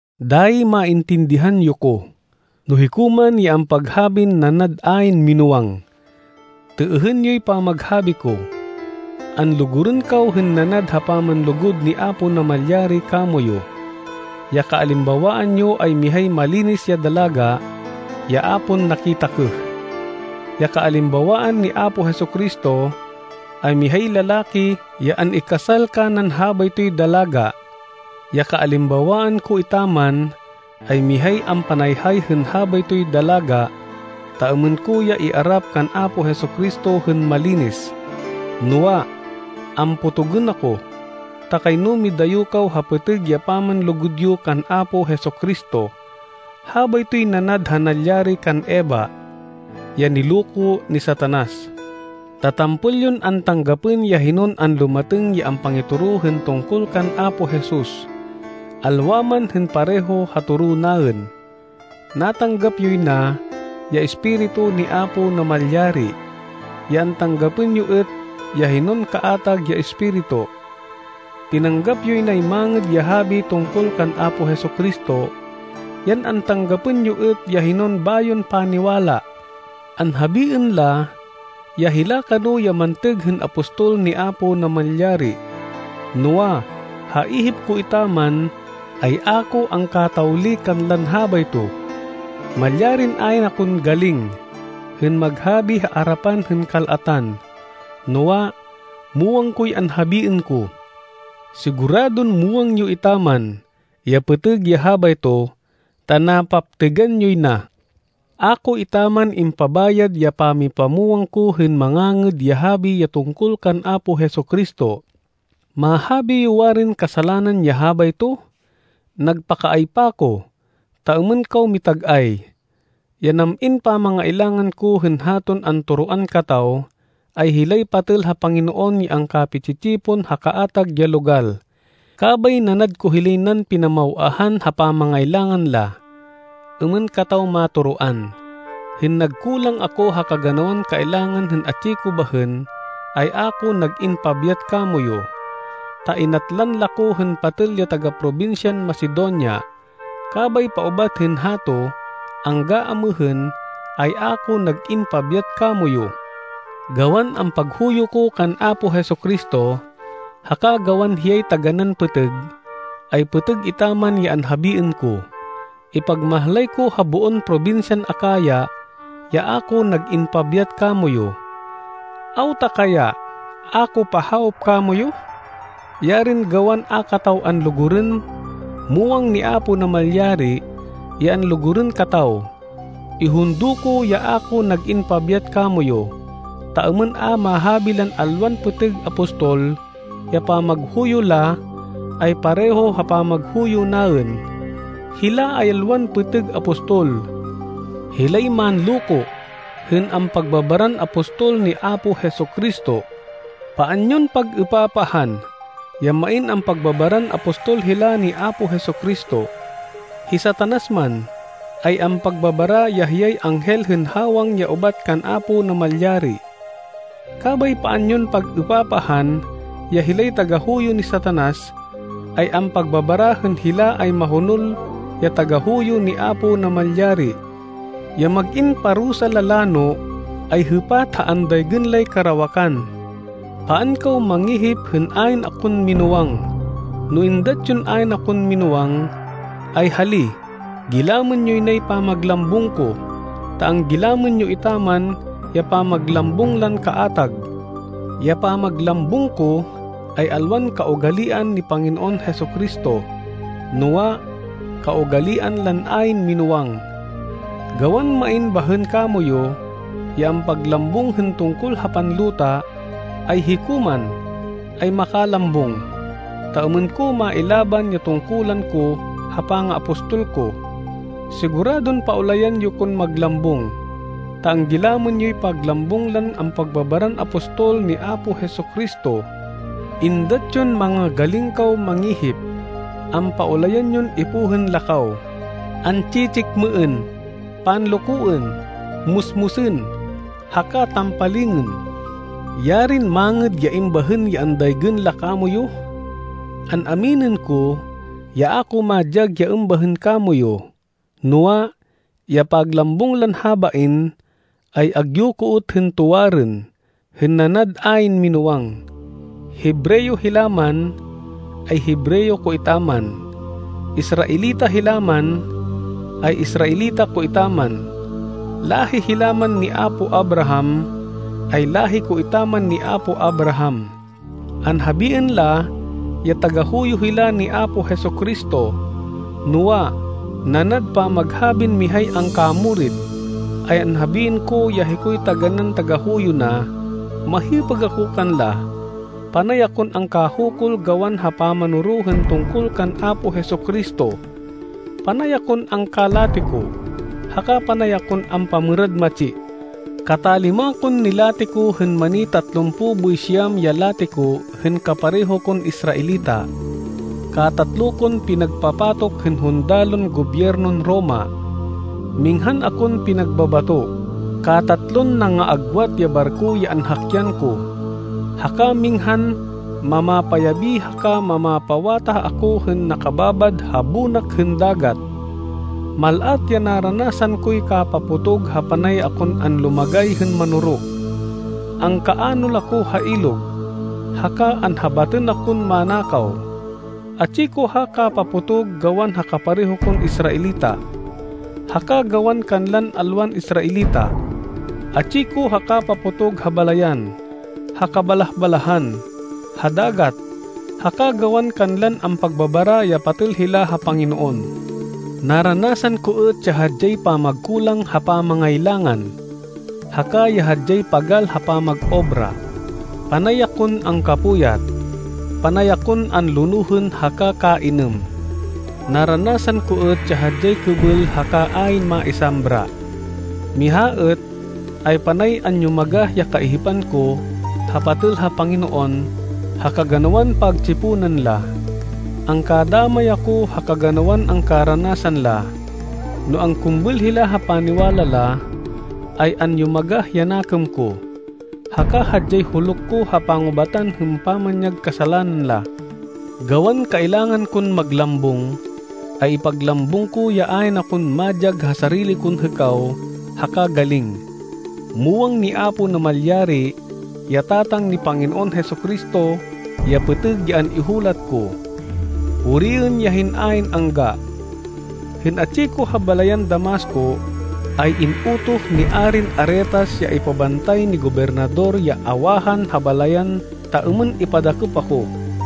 Dayi maintindihan yo ko, no hiko man ya ampaghabin nanad ayn minúwang. Têêhên yoy pamaghabi ko! Anlugurên kaw hên nanad ha pamanlugud ni Apo Namalyari kamoyu. Ya kaalimbawaan yo ay mihay malinis ya dalaga ya a pon nakitakêh. Ya kaalimbawaan ni Apo Jesu-Cristo, ay mihay lalaki ya an-ikasal kanan habaytoy dalaga. Ya kaalimbawaan ko etaman ay mihay ampanayhay hên habaytoy dalaga ta êmên ko ya iarap kan Apo Jesu-Cristo hên malinis. Noa, ampotogên ako, ta kayno midayo kaw ha pêtêg ya pamanlugud yo kan Apo Jesu-Cristo. Habaytoy nanad ha nalyari kan Eva, ya niloko ni Satanas. Ta tampol yon antanggapên ya hinon anlumatêng ya ampangitoro hên tungkol kan Apo Jesus, alwa man hên pareho ha toro naên. Natanggap yoy na ya Espiritu ni Apo Namalyari, yan antanggapên yo êt ya hinon kaatag ya espiritu. Tinanggap yoy nay Mangêd ya Habi tungkol kan Apo Jesu-Cristo, yan antanggapên yo êt ya hinon bayon paniwala. Anhabiên la ya hila kano ya mantêg hên apostol ni Apo Namalyari, noa, ha ihip ko etaman, ay a ko angkatawli kanlan habayto. Malyarin ayn akon galing hên mag-habi ha arapan hên kal-atan, noa, muwang koy anhabiên ko! Siguradon muwang yo etaman ya pêtêg ya habayto, ta napaptêgan yoy na. A ko etaman impabayad ya pamipamwang ko hên Mangangêd ya Habi ya tungkol kan Apo Jesu-Cristo. Mahabi yo warin kasalanan ya habayto? Nagpakaaypa ko, ta êmên kaw mitag-ay. Ya nam-in pamangailangan ko hên haton antoroan kataw, ay hilay patêl ha Panginoon ya angkapi-tsi-tsipon ha kaatag ya logal, kabay nanad ko hilay nan pinamaw-ahan ha pamangailangan la, êmên kataw matoroan. Hên nagkulang ako ha kaganawan kailangan hên atsi ko bahên, ay a ko nag-in pabyat kamoyu, ta inatlan la ko hên patêl ya taga-probinsyan Macedonia. Kabay paubat hên hato angga amêhên, ay a ko nag-in pabyat kamoyu. Gawan ampaghuyo ko kan Apo Jesu-Cristo, haka gawan hiyay taganán pêtêg, ay pêtêg etaman ya anhabiên ko. Ipagmahlay ko ha boon probinsyan Acaya, ya a ko nag-in pabyat kamoyu. Awta kaya, a ko pahawop kamoyu? Yarin gawan a kataw anlugurên! Muwang ni Apo Namalyari ya anlugurên kataw! Ihundo ko ya a ko nag-in pabyat kamoyu, ta êmên a mahabi lan alwan pêtêg apostol, ya pamaghuyo la, ay pareho ha pamaghuyo naên. Hila ay alwan pêtêg apostol. Hilay manloko hên ampagbabaran apostol ni Apo Jesu-Cristo. Paan yon pag-êpapahan ya main ampagbabaran apostol hila ni Apo Jesu-Cristo. Hi Satanas man, ay ampagbabara ya hiyay anghel hên hawang ya ubat kan Apo Namalyari. Kabay paan yon pag-êpapahan ya hilay tagahuyo ni Satanas, ay ampagbabara hên hila ay mahonol ya tagahuyo ni Apo Namalyari. Ya mag-in parusa la lano, ay hêpat ha andaygên lay karawakan. Paan kaw mangihip hên ayn akon minúwang. No êndat yon ayn akon minúwang, ay hali gilamên yoy nay pamaglambung ko, ta anggilamên yo etaman ya pamaglambung lan kaatag. Ya pamaglambung ko, ay alwan kaugalian ni Panginoon Jesu-Cristo, noa, kaugalian lan ayn minúwang. Gawan main bahên kamoyu ya ampaglambung hên tungkol ha panluta, ay hiko man, ay makalambung, ta êmên ko mailaban ya tungkulan ko ha pangaapostol ko. Siguradon paulayan yo kon maglambung, ta anggilamên yoy paglambung lan ampagbabaran apostol ni Apo Jesu-Cristo. Êndat yon manga-galing kaw mangihip! Ampaulayan yon ipohên la kaw, an-tsi-tsikmêên, panlokoên, musmusên, haka tampalingên. Yarin mangêd ya êmbahên ya andaygên la kamoyu! An-aminên ko ya a ko madyag ya êmbahên kamoyu! Noa, ya paglambung lan habain, ay agyu ko êt hên tuwarên, hên nanad ayn minúwang. Hebreo hila man, ay Hebreo ko etaman! Israelita hila man, ay Israelita ko etaman! Láhi hila man ni apo Abraham, ay láhi ko etaman ni apo Abraham. Anhabiên la ya tagahuyo hila ni Apo Jesu-Cristo, noa, nanad pamaghabin mihay angkamurit, ay anhabiên ko ya hikoy taganán tagahuyo na. Mahipêg ako kanla, panay akon angkahukul gawan ha pamanoro hên tungkol kan Apo Jesu-Cristo, panay akon angkalatiko, haka panay akon ampamêrad matsi. Katalima kon nilatiko hên mani tatlumpo boy siyam ya latiko hên kapareho kon Israelita. Katatlo kon pinagpapatok hên hundalon gobyernon Roma. Minghan akon pinagbabato, katatlon nangaagwat ya barko ya anhakyan ko, haka minghan mamapayabi haka mamapawatah ako hên nakababad ha bonak hên dagat. Mal-at ya naranasan koy kapapotog ha panay akon anlumagay hên manoro. Angkaanol ako ha ilog, haka anhabatên akon manakaw. Atsi ko ha kapapotog gawan ha kapareho kon Israelita, haka gawan kanlan alwan Israelita. Atsi ko ha kapapotog ha balayan, ha kabalah-balahan, ha dagat, haka gawan kanlan ampagbabara ya patêl hila ha Panginoon. Naranasan ko êt ya hadyay pamagkulang ha pamangailangan, haka ya hadyay pagal ha pamag-obra. Panay akon angkapuyat, panay akon anlonohên haka kainêm. Naranasan ko êt ya hadyay kêbêl haka ayn maisambra. Miha êt, ay panay anyumagah ya kaihipan ko ha patêl ha Panginoon ha kaganawan pagtsiponan la. Angkadamay ako ha kaganawan angkaranasan la, no angkumbêl hila ha paniwala la, ay anyumagah ya nakêm ko. Haka hadyay huluk ko ha pangubatan hên pamanyag kasalanan la. Gawan kailangan kon maglambung, ay ipaglambung ko ya ayn akon madyag ha sarili kon hêkaw haka galing. Muwang ni Apo Namalyari ya Tatang ni Panginoon Jesu-Cristo ya pêtêg ya an-ihulat ko. Puriên ya hên ayn-angga! Hên atsi ko ha balayan Damasco, ay in-utoh ni Arin Aretas ya ipabantay ni gobernador ya awahan ha balayan ta êmên ipadakêp ako.